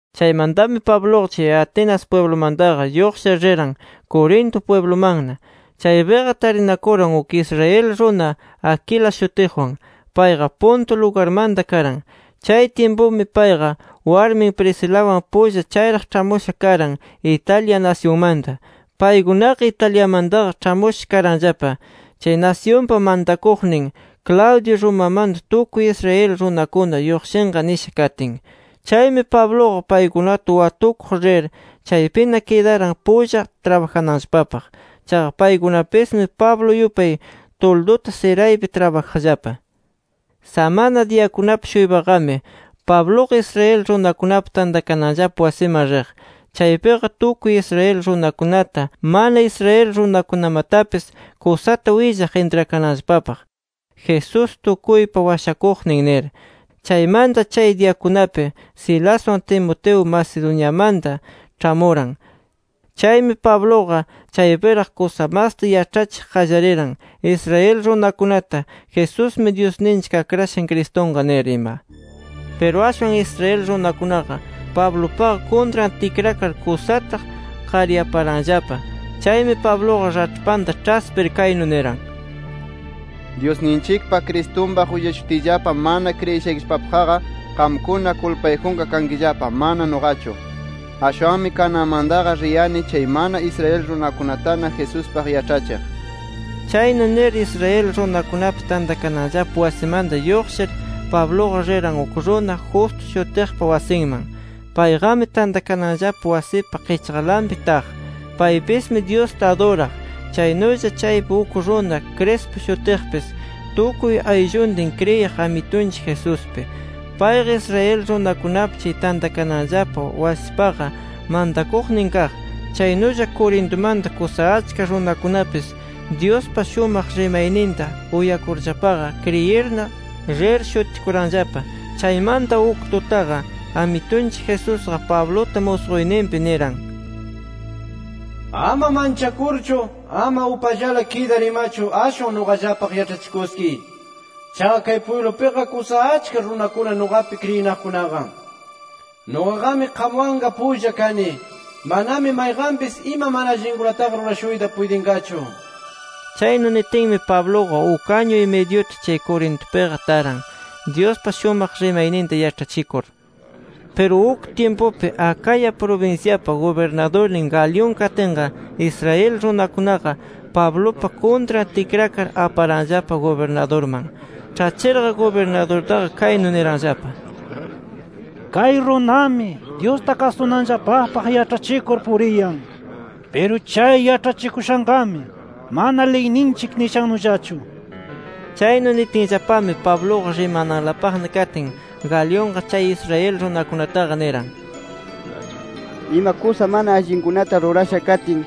Chaymantami Pabluqa chay Atenas pwiblumantaqa lluqshir, riran Corinto pwiblumanna. Chaypiqa tarinakuran uk Israel runa Aquila shutiqwan. Payqa Ponto lugarmanta karan. Chay tyimpumi, payqa warmin Priscilawan pulla chayraq ĉhamusha karan Italia nasyunmanta. Paykunaqa Italiamantaqa ĉhamusha karanllapa, chay nasyunpa mantakuqnin Claudio, Romamanta tukuy Israel runakuna lluqshinqa nisha katin. Chaymi Pabluqa paykunata watukuq rir, chaypina kidaran, pulla trabajananllapapaq. Chaqa paykunapismi Pablo yupay tulduta siraypi trabajaqllapa. Samana diyakunapi-shuypaqami Pabluqa Israel runakunapa tantakananllapa wasiman riq. Chaypiqa tukuy Israel runakunata, mana Israel runakunamatapis, kusata willaq intrakananllapapaq, Jesús tukuypa Washakuqnin nir. Chaymanta chay diyakunapi Silaswan Timoteo Macedoniamanta ĉhamuran. Chaymi Pabluqa chaypiraq kusa masta yaĉhachiq qallariran Israel runakunata “Jesusmi Dyusninchik Akrashan Cristunqa” nir ima. Piru ashwan Israel runakunaqa, Pablupaqa kuntran tikrakar kusata qaryaparanllapa. Chaymi Pabluqa raĉhpanta ĉhaspir kaynu niran: —Dyusninchikpa Cristunpaq willashutiyllapa, mana kriyishaykillapapaqqa qamkunana kulpayjunqa kankillapa, mana nuqachu. Ashwanmi kananmantaqa riyani chay mana Israel runakunatana Jesuspaq yaĉhachiq. Chaynu nir, Israel runakunapa tantakananllapa wasimanta lluqshir, Pabluqa riran uk runa Justo shutiqpa wasinman. Payqami tantakananllapa wasipa qichqanlapi taq. Paypismi Dyusta aduraq. Chaynulla chaypi uk runa Crispo shutiqpis, tukuy aylluntin kriyiq Amitunchik Jesuspi. Payqa Israel runakunapa chay tantakananllapa wasipaqa mantakuqnin kaq. Chaynulla Corintumanta kusa achka runakunapis Dyuspa shumaq rimayninta uyakurllapaqa, kriyirna rir shutikuranllapa. Chaymanta uk tutaqa, Amitunchik Jesusqa Pabluta musquyninpi niran: “Ama manchakurchu, ama upallala kidar imachu ashwan nuqallapaq yaĉhachikuskiy. Chaqa kay pwiblupiqa kusa achka runakuna nuqapi kriyinaqkunaqa. Nuqaqami qamwanqa pulla kani, manami mayqanpis ima mana allinkunataqa rurashuyta puytinqachu” nir. Chaynu nitinmi, Pabluqa uk añu-y-midyuta chay Corintupiqa taran, Dyuspa shumaq rimayninta yaĉhachikur. Piru uk tyimpupi, Acaya prubinsyapa gubirnadurnin Galión katinqa, Israel runakunaqa Pablupa kuntran tikrakar, aparanllapa gubirnadurman. Ĉhachirqa gubirnadurtaqa, kaynu niranllapa: —Kay runami Dyusta kasunanllapapaq yaĉhachikur puriyan. Piru chay yaĉhachikushanqami mana liyninchik nishannullachu nir. Chaynu nitinllapami Pabluqa rimananlapaqna katin, Galionqa chay Israel runakunataqa niran: —Ima kusa mana allinkunata rurasha katin,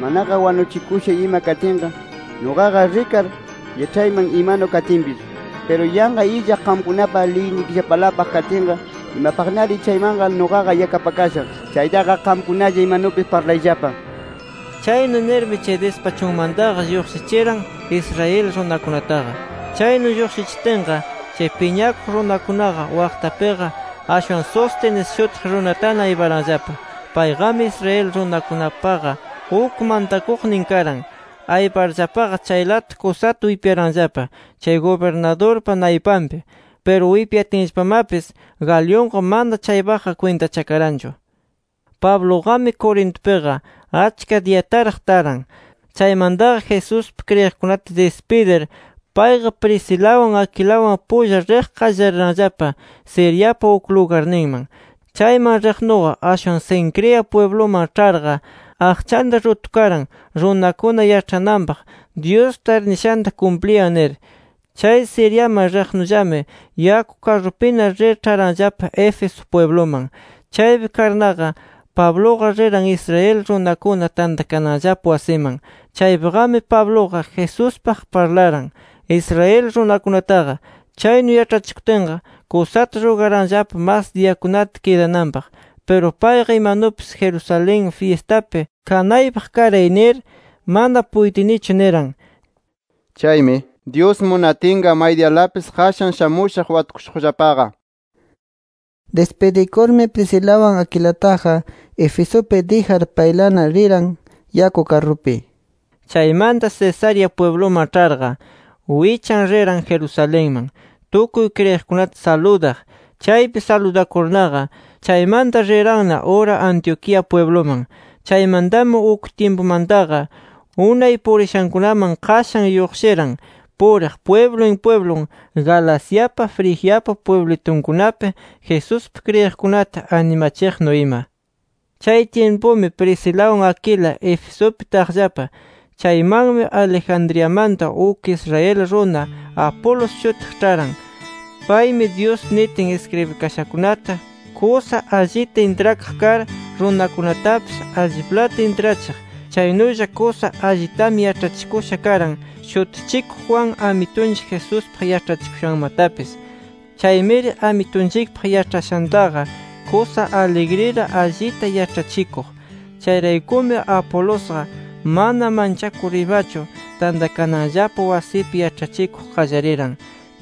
manaqa wanuchikusha ima katinqa, nuqaqa rikar yaĉhayman imanu katinpis. Piru yanqa illaq qamkunapa liynikillapalapaq katinqa imapaqnari chaymanqa nuqaqa yakapakashaq. Chaytaqa qamkunalla imanupis parlayllapa nir. Chaynu nirmi chay dispachunmantaqa lluqshichiran, Israel runakunataqa. Chaynu lluqshichitinqa, chay piñakuq runakunaqa waqtapiqa ashwan Sóstenes shutiq runatana ayparanllapa. Payqami Israel runakunapaqa uk mantakuqnin karan. Ayparllapaqa chaylata kusata wipyaranllapa, chay gubirnadurpa naypanpi. Piru wipyatinllapamapis Galionqa, mana chaypaqqa kwintachakaranchu. Pabluqami Corintupiqa achka diyataraq taran. Chaymantaqa Jesuspi kriyiqkunata dispidir, payqa Priscilawan, Aquilawan pulla riq qallariranllapa Siriapa uk lugarninman. Chayman riqnuqa, ashwan Cencrea pwibluman ĉharqa aqchanta rutukaran, runakuna yaĉhananpaq, Dyusta arnishanta kumpliyan nir. Chay Siriaman riqnullami yaku karrupina rir ĉharanllapa Éfeso pwibluman. Chaypi karnaqa, Pabluqa riran Israel runakuna tantakananllapa wasiman. Chaypiqami Pabluqa, Jesuspaq parlaran Israel runakunataqa. Chaynu yaĉhachikutinqa kusata rugaranllapa mas diyakunata kidananpaq. Piru payqa, [“Imanupis Jerusalén fyistapi kanaypaq karay” nir] “Mana puytinichu” niran. Chaymi “Dyus munatinqa may diyalapis, qashan shamushaq watukushuqllapaqa” nir dispidikurmi, Priscilawan Aquilataqa Efesupi dijar paylana riran yaku karrupi. Chaymanta Cesarea pwibluman ĉharqa wichan riran Jerusalenman tukuy kriyiqkunata saludaq. Chaypi saludakurnaqa, chaymanta riranna ura Antioquía pwibluman. Chaymantami uk tyimpumantaqa, unay purishankunaman qashan lluqshiran puriq pwiblun pwiblun, Galaciapa, Frigiapa pwiblitunkunapi Jesuspi kriyiqkunata animachiqnu ima. Chay tyimpumi Priscilawan Aquila Efesupi taqllapa. Chaymanmi, Alejandriamanta uk Israel runa Apolos shutiq ĉharan. Paymi Dyus nitin iskribikashakunata kusa allita intrakaq kar, runakunatapis alliplata intrachiq. Chaynulla kusa allitami yaĉhakusha karan Shutichikuq Juan, Amitunchik Jesuspaq yaĉhachikushanmatapis. Chaymiri Amitunchikpaq yaĉhashantaqa, kusa aligrila allita yaĉhachikuq. Chayraykumi, Apolosqa mana manchakur imachu, tantakananllapa wasipi yaĉhachikuq qallariran.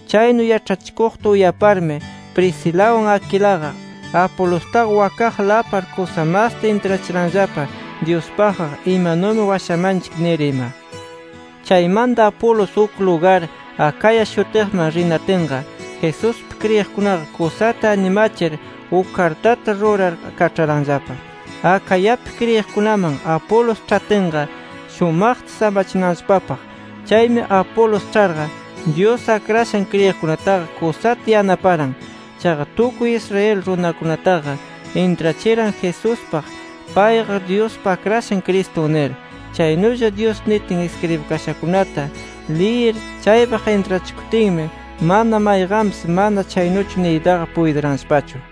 Chaynu yaĉhachikuqta uyaparmi, Priscilawan Aquilaqa, Apolostaqa wakaqla apar kusa masta intrachiranllapa Dyuspaqqa, imanumi washamanchik nir ima. Chaymanta Apolos uk lugar Acaya shutiqman rinatinqa, Jesuspi kriyiqkunaqa, kusata animachir uk kartata rurar kaĉharanllapa Acayapi kriyiqkunaman, Apolos ĉhatinqa shumaqta samachinanllapapaq. Chaymi Apolos ĉharqa, Dyus akrashan kriyiqkunataqa, kusata yanaparan. Chaqa tukuy Israel runakunataqa intrachiran Jesuspaq, payqa Dyuspa Akrashan Cristun nir. Chaynulla Dyus nitin iskribikashakunata liyir chaypaq intrachikutinmi, mana mayqanpis mana chaynuchu niytaqa puytiranllapachu.